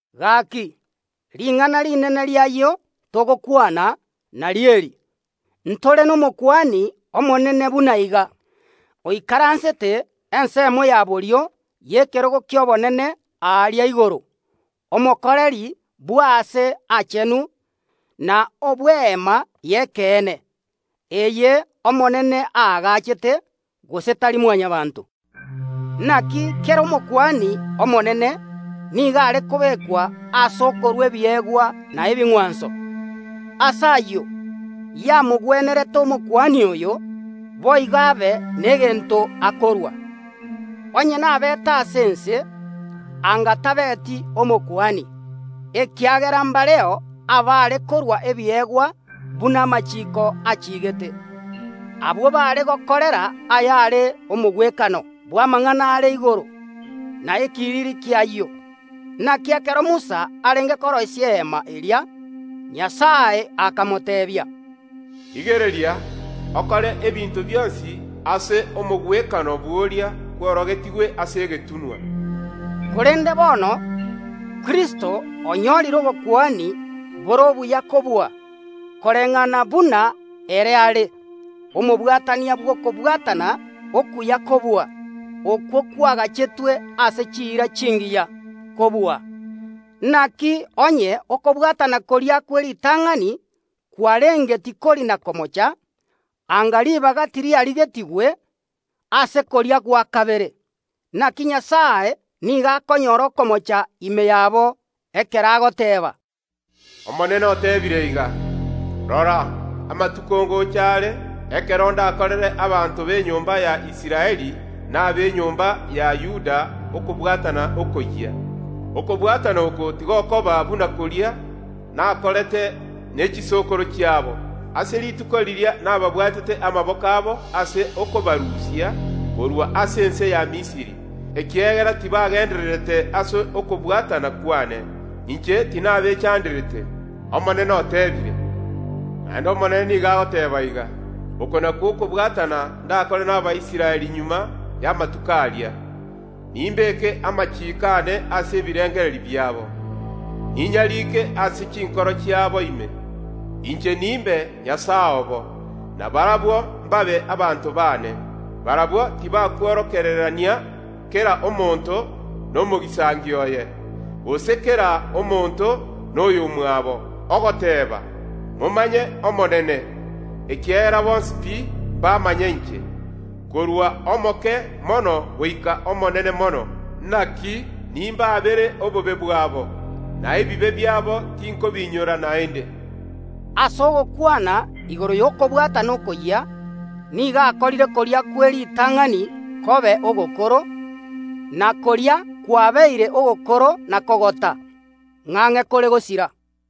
Gaki, ring’ana rinene ri’ayio togokwana nario eri: Ntore n’Omokuani Omonene buna iga, oikaransete ensemo ya borio y’ekerogo ki’Obonene aria igoro, omokoreri bw’aase aachenu na obw’Eema y’ekeene, eye Omonene aagachete, gose tari Mwanyabaanto. Naki kera Omokuani omonene nigo are kobekwa ase okorua ebiegwa na ebing’wanso. Ase ayio yamogwenerete Omokuani oyo boigo abe negento akorua. Onye nabeete ase ense, anga tabeti Omokuani, ekiagera mbareo abare korua ebiegwa buna amachiiko achigete. Abwo baare gokorera ayare omogwekano bw’amang’ana are igoro, na ekiriri ki’ayio. Naki ekero Musa arenge koroisia Eema eria, Nyasae akamoteebia, “Rigereria, okore ebinto bionsi ase omogwekano bw’oria kworogetigwe ase egetunwa.” Korende bono Kristo onyorire obokuani bore obuya kobua, koreng’ana buna ere are omobwatania bw’okobwatana okuya kobua, okwo kwagachetwe ase chiira chingiya kobua. Naki onye okobwatana koria kw’eritang’ani kwarenge tikori na komocha, anga ribaga tiriarigetigwe ase koria gwa kabere. Naki Nyasae nigo akonyora okomocha ime yabo ekero agoteeba “Omonene oteebire iga: Rora, amatuko ngocha are ekero ndakorere abanto b’enyomba ya Israeli na ab’enyomba ya Yuda okobwatana okoyia. Okobwatana oko tigokoba buna koria nakorete ne chisokoro chiabo, ase rituko riria nababwatete amaboko abo ase okobarusia korwa ase ense ya Misiri. Ekiagera tibagendererete ase okobwatana kwane, inche tinabechanderete, Omonene oteebire. Naende Omonene nigo agoteeba iga: Oko nakwo okobwatana ndakore n’Abaisraeli magega y’amatuko aria: Nimbeke amachiiko aane ase ebirengererio biabo, ninyarike ase chinkoro chiabo ime; inche nimbe Nyasae obo, na barabwo mbabe abanto baane. Barabwo tibakworokererania kera omonto nomogisangio oye, gose kera omonto noyomwabo, ogoteeba: Momanye omonene, ekiagera bonsi pi mbamanye inche, korwa omoke mono goika omonene mono. Naki nimbaabere obobe bwabo, na ebibe biabo tinkobiinyora naende.” Ase ogokwana igoro y’okobwatana okoyia nigo akorire koria kw’eritang’ani kobe ogokoro, na koria kwabeire ogokoro na kogota, ng’ang’e kore gosira.